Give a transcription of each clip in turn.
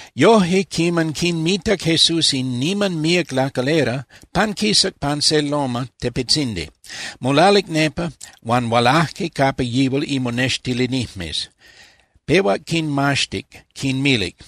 Yoje, quiman quinmitac Jesús in niman míac lacalera, panquisac pan se loma (tepetzindi). Molalic nepa, huan hualaje capa yihual imonextilinijmes. Pehuac quinmaxtic, quinmilic: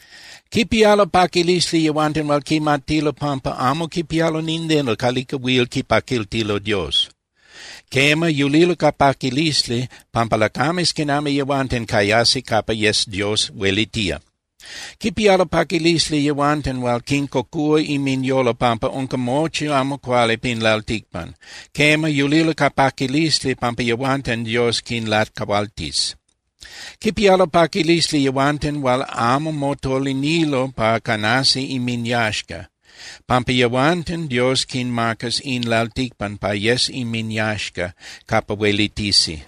—Quipialo paquilisli yehuanten hual quimatilo pampa amo quipialo nindeno calica huil quipaquiltilo Dios. Quema, yulilo ca paquilisli, pampa lacames quinami yehuanten cayasi capa yes Dios huelitía. ’Quipialo paquilisli yehuanten hual quincocúa inminyolo pampa unca mochi amo cuali pin lalticpan. Quema, yulilo ca paquilisli, pampa yehuanten Dios quinlacahualtis. ’Quipialo paquilisli yehuanten hual amo motolinilo pa canasi inminyaxca, pampa yehuanten Dios quinmacas in lalticpan pa yes inminyaxca capa huelitisi.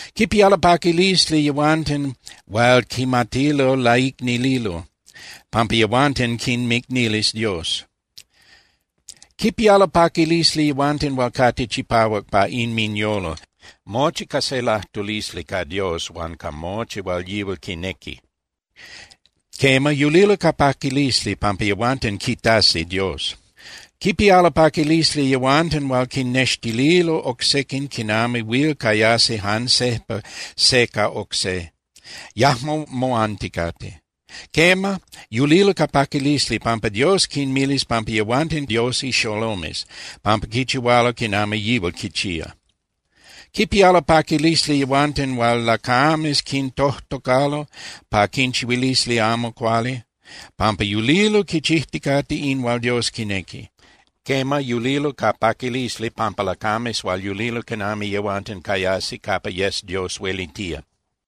’Quipialo paquilisli yehuanten hual quimatilo laicnililo, pampa yehuanten quinmicnilis Dios. ’Quipialo paquilisli yehuanten hual cate chipahuac pa inminyolo, mochi ca se lajtulisli ca Dios huan ca mochi hual Yihual quinequi. Quema, yulilo ca paquilisli, pampa yehuanten quitasi Dios. ’Quipialo paquilisli yehuanten hual quinnextililo oc sequin quinami huil cayasi jan sejpa se ca oc se, yajmo moanticate. Quema, yulilo ca paquilisli, pampa Dios quinmilis pampa yehuanten Dios ixolomes, pampa quichihualo quinami Yihual quichía. ’Quipialo paquilisli yehuanten hual lacames quintojtocalo pa quinchihuilisi amo cuali pampa yulilo quichijticate in hual Dios quinequi. Quema, yulilo ca paquilisli pampa lacames hual yulilo quinami yehuanten cayasi capa yes Dios huelitía.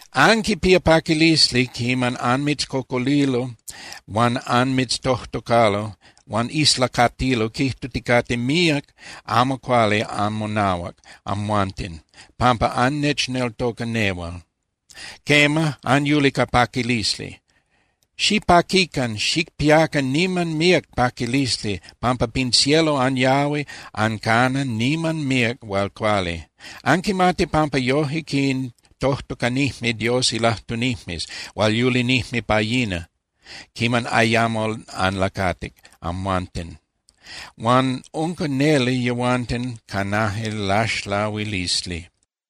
’Anquipía paquilisli quiman anmitzcocolilo huan anmitztojtocalo huan islacatilo quijtuticate míac amo cuali anmonahuac amhuanten pampa annechneltoca nehual. Quema, anyuli ca paquilisli. Xipaquican, xicpiacan niman míac paquilisli, pampa pin cielo anyahui ancana niman míac hual cuali. Anquimati pampa yoje quintojtocanijme Dios ilajtunijmes hual yulinijme pa yina quiman ayamo anlacatic amhuanten, huan unca neli yehuanten canaje laxlahuilisli.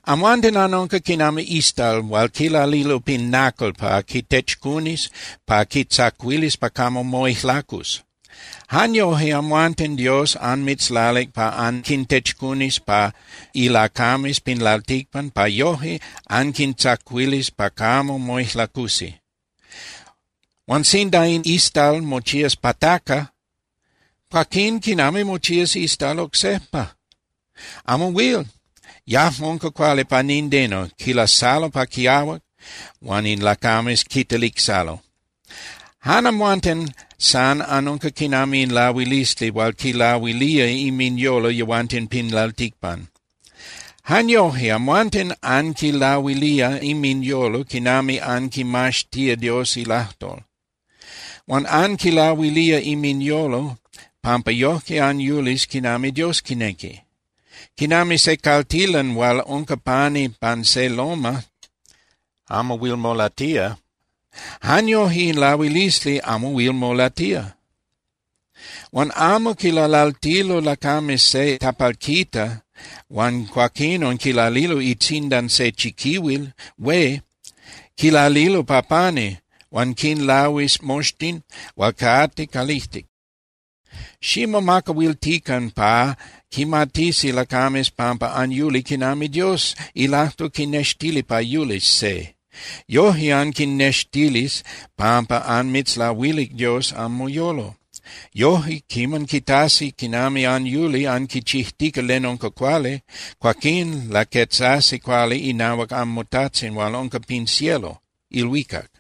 ’Amhuanten anunca quinami istal hual quilalilo pin nacal pa quitechcunis pa quitzacuilis pa camo moijlacus. Jan yoje amhuanten Dios anmitzlalic pa anquintechcunis pa ilacames pin lalticpan pa yoje anquintzacuilis pa camo moijlacusi. Huan sinda in istal mochías pataca, cuaquín ¿quinami mochías istal oc sejpa? Amo huil, yajmo unca cuali pa nindeno. Quilasalo pa quiahuac huan in lacames quitelicsalo. ’Jan amhuanten san anunca quinami in lahuilisli hual quilahuilía inminyolo yehuanten pin lalticpan. Jan yoje amhuanten anquinlahuilía inminyolo quinami anquinmaxtía Dios ilajtol. Huan anquinlahuilía inminyolo pampa yojque anyulis quinami Dios quinequi. Quinami se caltilan hual unca pani pan se loma (tepel) amo huil molatía, jan yoje in lahuilisli amo huil molatía. Huan amo quilalaltilo lacames se tapalquita huan cuaquinon quilalilo itzindan se chiquihuil hué. Quilalilo pa pani, huan quinlahuis moxtin hual cate calijtic. Ximomacahuiltican pa quimatisi lacames pampa anyuli quinami Dios ilajtol quinextilía pa yulis se. Yoje anquinextilis pampa anmitzlahuilic Dios anmoyolo. Yoje quiman quitasi quinami anyuli anquichijtica len unca cuali, cuaquín laquetzasi cuali inahuac anmoTajtzin hual unca pin cielo (ilhuicac).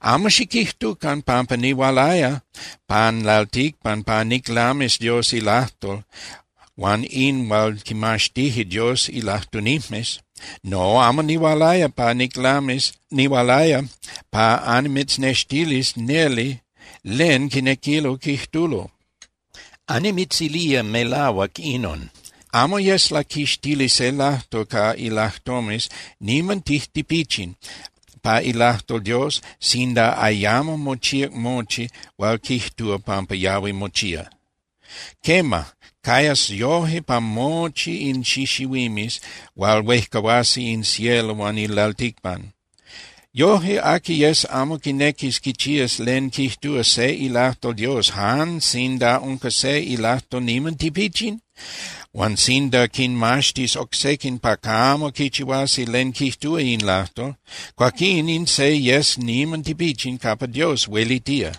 ’Amo xiquijtucan pampa nihualaya pan lalticpan pa niclamis Dios ilajtol huan in hual quimaxtije Dios ilajtunijmes. No, amo nihualaya pa niclamis, nihualaya pa annimitznextilis neli len quinequilo quijtulo. Annimitzilía melahuac inon: Amo yes laquixtili se lajtol ca ilajtomes niman tijtipichin pa ilajtol Dios sinda ayamo mochíac mochi hual quijtúa pampa yahui mochía. Quema, cayas yoje pa mochi in xixihuimes hual huejcahuasi in cielo huan in lalticpan. Yoje, aqui yes amo quinequis quichías len quijtúa se ilajtol Dios jan sinda unca se ilajtol niman tipichin, huan sinda quinmaxtis oc sequin pa camo quichihuasi len quijtúa in lajtol, cuaquín in se yes niman tipichin capa Dios huelitía.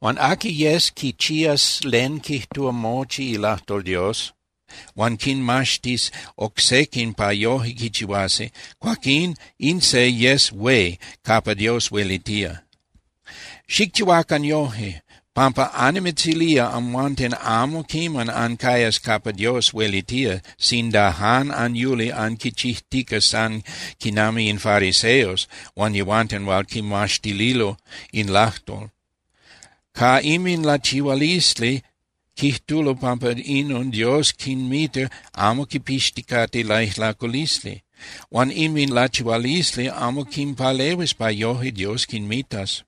Huan aqui yes quichías len quijtúa mochi ilajtol Dios huan quinmaxtis oc sequin pa yoje quichihuasi, cuaquín in se yes hué capa Dios huelitía. Xicchihuacan yoje, pampa annimitzilía amhuanten amo quiman ancayas capa Dios huelitía sinda jan anyuli anquichijtica san quinami in fariseos huan yehuanten hual quimaxtilo in lajtol. Ca inminlachihualisli quijtulo pampa inon Dios quinmita amo quipixticate laijlaculisli. Huan inminlachihualisli amo quinpalehuis pa yoje Dios quinmitas.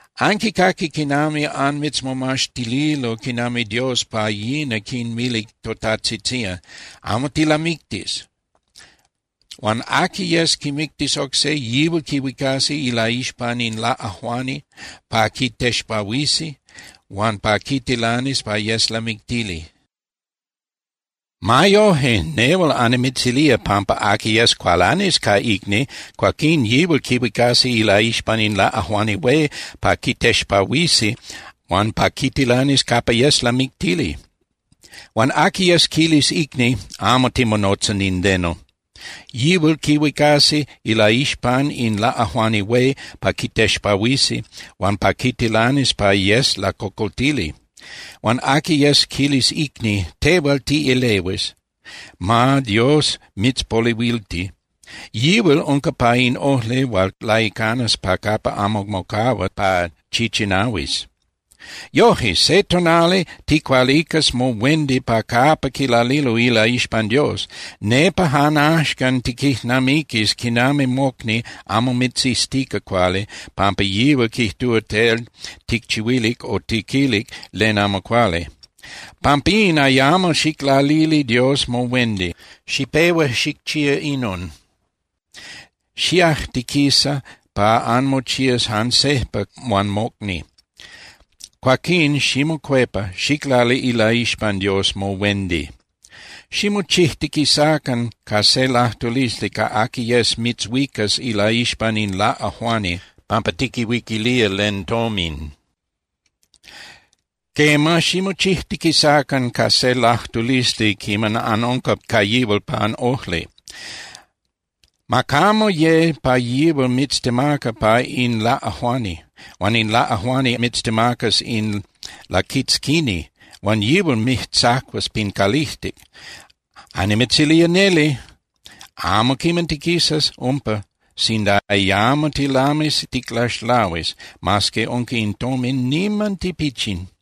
’Anquicaqui quiman anmitzmomaxtililo quinami Dios pa yina quinmilic totajtzitzían: “Amo tilamictis. Huan aqui yes quimictis oc se, yihual quihuicasqui ilaixpan in laꞌajuani pa quitexpahuisi huan pa quitilanis pa yes lamictili.” Ma yoje, nehual annimitzilía pampa aqui yes cualanis ca icni, cuaquín yihual quihuicasi ilaixpan in laꞌajuani hué pa quitexpahuisi huan pa quitilanis capa yes lamictili. Huan aqui yes quilis icni: “Amo timonotza nindeno”, yihual quihuicasi ilaixpan in laꞌajuani hué pa quitexpahuisi huan pa quitilanis pa yes lacocoltili. Huan aqui yes quilis icni: “Tehual tiꞌelehuis, ma Dios mitzpolehuilti”, yihual unca pa in ojli hual laicanas pa capa amo mocahua pa chichinahuis. ’Yoje, se tonali ticualicas mohuendi pa capa quilalilo ilaixpan Dios. Nepa jan axcan tiquijnamiquis quinami mocni amo mitziztica cuali pampa yihual quijtúa tel ticchihuilic o tiquilic len amo cuali. Pampín ayamo xiclalili Dios mohuendi. Xipehua xicchía inon: Xiajtiquisa pa anmochías jan sejpa huan mocni. Cuaquín ximocuepa, xiclali ilaixpan Dios mohuendi. ’Ximochijtiquisacan ca se lajtulisli ca aqui yes mitzhuicas ilaixpan in laꞌajuani pampa tiquihuiquilía len tomin. Quema, ximochijtiquisacan ca se lajtulisli quiman anunca ca yihual pan ojli. Ma camo ye pa yihual mitztemaca pa in laꞌajuani, huan in laꞌajuani mitztemacas in laquitzquini huan yihual mijtzacuas pin calijtic. Annimitzilía neli, amo quiman tiquisas umpa sinda ayamo tilamis ticlaxlahuis, mas que unca in tomin niman tipichin.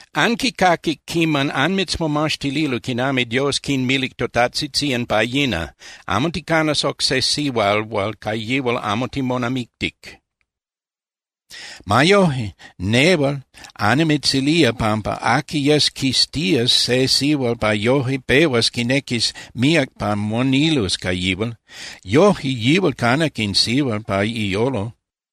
’Anquicaquic quiman anmitzmomaxtililo quinami Dios quinmilic totajtzitzían pa yina: “Amo ticanas oc se sihual hual ca yihual amo timonamictic.” Ma yoje, nehual annimitzilía pampa aqui yes quiztías se sihual pa yoje pehuas quinequis míac pa monilus ca yihual, yoje yihual canac in sihual pa iyolo.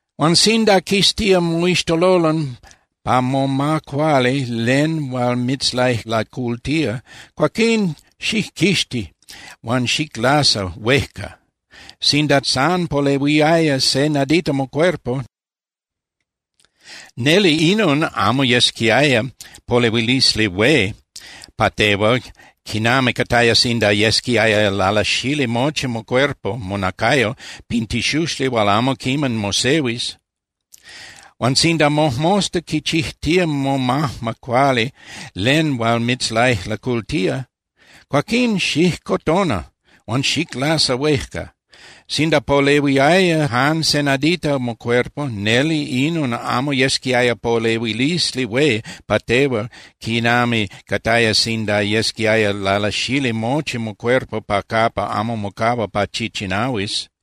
’Huan sinda quiztía moixtololon pa moma cuali len hual mitzlaijlacultía, cuaquín xijquixti huan xiclasa huejca. Sinda san polehuiaya se nadita mocuerpo, neli inon amo yesquiaya polehuilisli hué pa tehual quinami cataya sinda yesquiaya lalasali mochi mocuerpo (monacayo) pin tixuxli hual amo quiman mosehuis. Huan sinda mojmosta quichijtía momajma cuali len hual mitzlaijlacultía, cuaquín xijcotona huan xiclasa huejca. Sinda polehuiaya jan se nadita mocuerpo, neli inon amo yesquiaya polehuilisli hué pa tehual quinami cataya sinda yesquiaya lalasali mochi mocuerpo pa capa amo mocahua pa chichinahuis.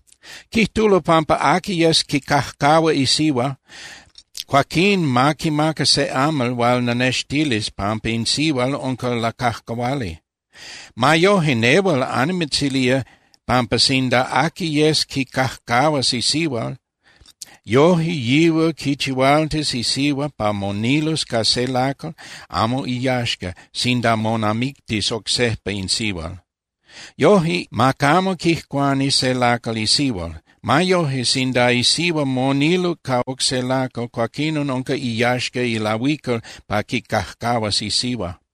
’Quijtulo pampa aqui yes quicajcahua isihua, cuaquín ma quimaca se amal hual lanextilis pampa in sihual unca lacajcahuali. Ma yoje, nehual annimitzilía pampa sinda aqui yes quicajcahuas isihua, yoje yihual quichihualtis isihua pa monilus ca se lacal amo iyaxca sinda monamictis oc sejpa in sihual. Yoje, ma camo quijcuani se lacal isihua. Ma yoje, sinda isihua moniluc ca oc se lacal, cuaquinon unca iyaxca ilahuical pa quicajcahuas isihua.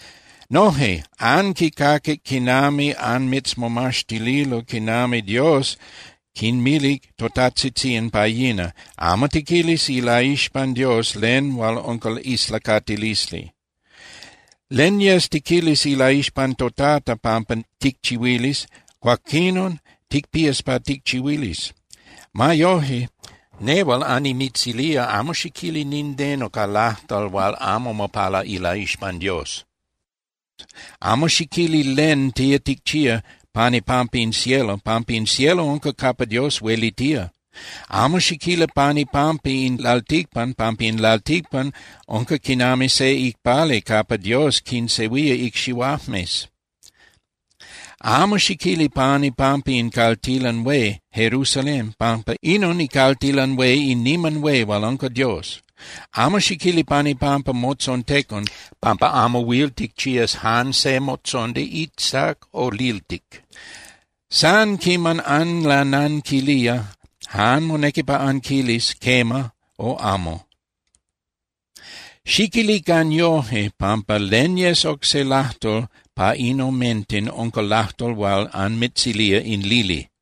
’Noje, anquicaquic quiman anmitzmomaxtililo quinami Dios quinmilic totajtzitzían pa yina: “Amo tiquilis ilaixpan Dios len hual unca islacatilisli. Len yes tiquilis ilaixpan toTata pampa ticchihuilis, cuaquinon ticpías pa ticchihuilis.” Ma yoje, nehual annimitzilía amo xiquili nindeno ca lajtol hual amo mopala ilaixpan Dios. Amo xiquili len tía ticchía pan ipampa in cielo, pampa in cielo unca capa Dios huelitía. Amo xiquili pan ipampa in lalticpan, pampa in lalticpan unca quinami se icpali capa Dios quinsehuía icxihuajmes. Amo xiquili pan ipampa in caltilan hué Jerusalén, pampa inon icaltilan hué in Niman Hué hual unca Dios. Amo xiquili pan ipampa motzontecon, pampa amo huil ticchías jan se motzondi iztac o liltic. San quiman anlananquilía, jan monequi pa anquilis “quema” o “amo”. Xiquilican yoje, pampa len yes oc se lajtol pa in omenten unca lajtol hual anmitzilía in lili.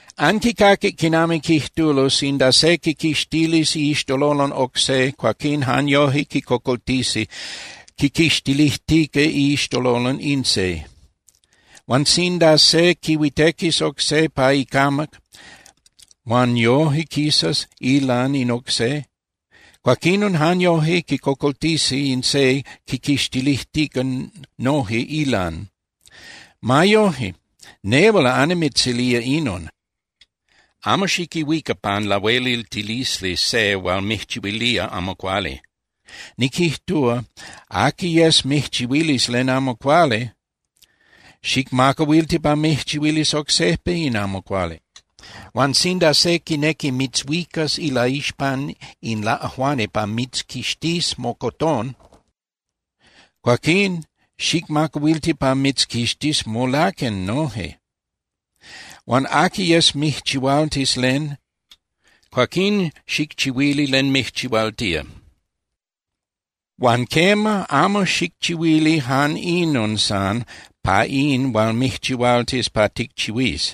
’Anquicaquic quinami quijtulo: “Sinda se quiquixtilis iixtololon oc se, cuaquín jan yoje quicocoltisi quiquixtilijtica iixtololon in se. Huan sinda se quihuitequis oc se pa icamac huan yoje quisas ilan in oc se, cuaquinon jan yoje quicocoltisi in se quiquixtilijtica noje ilan.” Ma yoje, nehual annimitzilía inon: Amo xiquihuica pan lahueliltilisli se hual mijchihuilía amo cuali. Niquijtúa aqui yes mijchihuilis len amo cuali, xicmacahuilti pa mijchihuilis oc sejpa in amo cuali. Huan sinda se quinequi mitzhuicas ilaixpan in laꞌajuani pa mitzquixtís mocotón, cuaquín xicmacahuilti pa mitzquixtís molaquen noje. Huan aqui yes mijchihualtis len, cuaquín xicchihuili len mijchihualtía. Huan quema, amo xicchihuili jan inon san pa in hual mijchihualtis pa ticchihuís,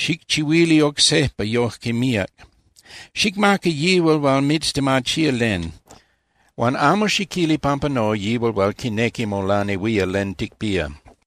xicchihuili oc sejpa yoje míac. Xicmaca yihual hual mitztemachía len. Huan amo xiquili pampa no yihual hual quinequi molanehuía len ticpía.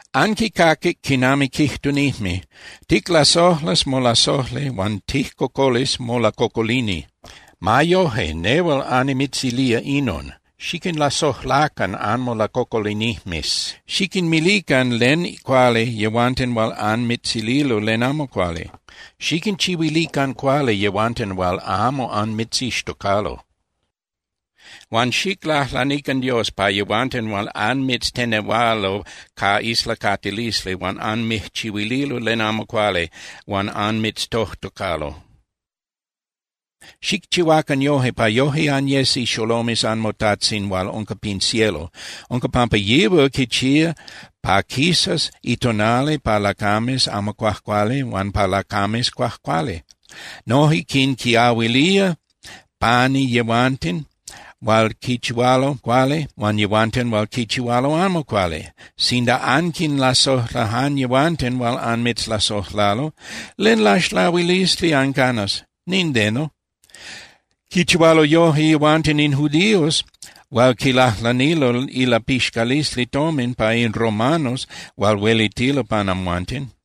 ’Anquicaquic quinami quijtunijme: “Ticlasojlas molasojli huan tijcocolis molacocolini.” Ma yoje, nehual annimitzilía inon: Xiquinlasojlacan anmolacocolinijmes. Xiquinmilican len cuali yehuanten hual anmitzililo len amo cuali, xiquinchihuilican cuali yehuanten hual amo anmitzixtocalo, huan xiclajlanican Dios pa yehuanten hual anmitztenehualo ca islacatilisli huan anmijchihuililo len amo cuali huan anmitztojtocalo. Xicchihuacan yoje pa yoje anyes ixolomes anmoTajtzin hual unca pin cielo. Unca pampa yihual quichía pa quisas itonali pa lacames amo cuajcuali huan pa lacames cuajcuali. Noje quinquiahuilía pani yehuanten hual quichihualo cuali huan yehuanten hual quichihualo amo cuali. Sinda anquinlasojla jan yehuanten hual anmitzlasojlalo, ¿len laxlahuilisli ancanas? Nindeno. Quichihualo yoje yehuanten in judíos hual quilajlanilo ilapixcalisli tomin pa in romanos hual huelitilo pan amhuanten.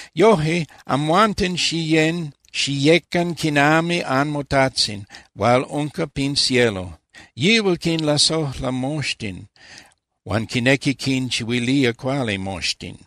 Yoje, amhuanten xiyén (xiyecan) quinami anmoTajtzin hual unca pin cielo. Yihual quinlasojla moxtin huan quinequi quinchihuilía cuali moxtin.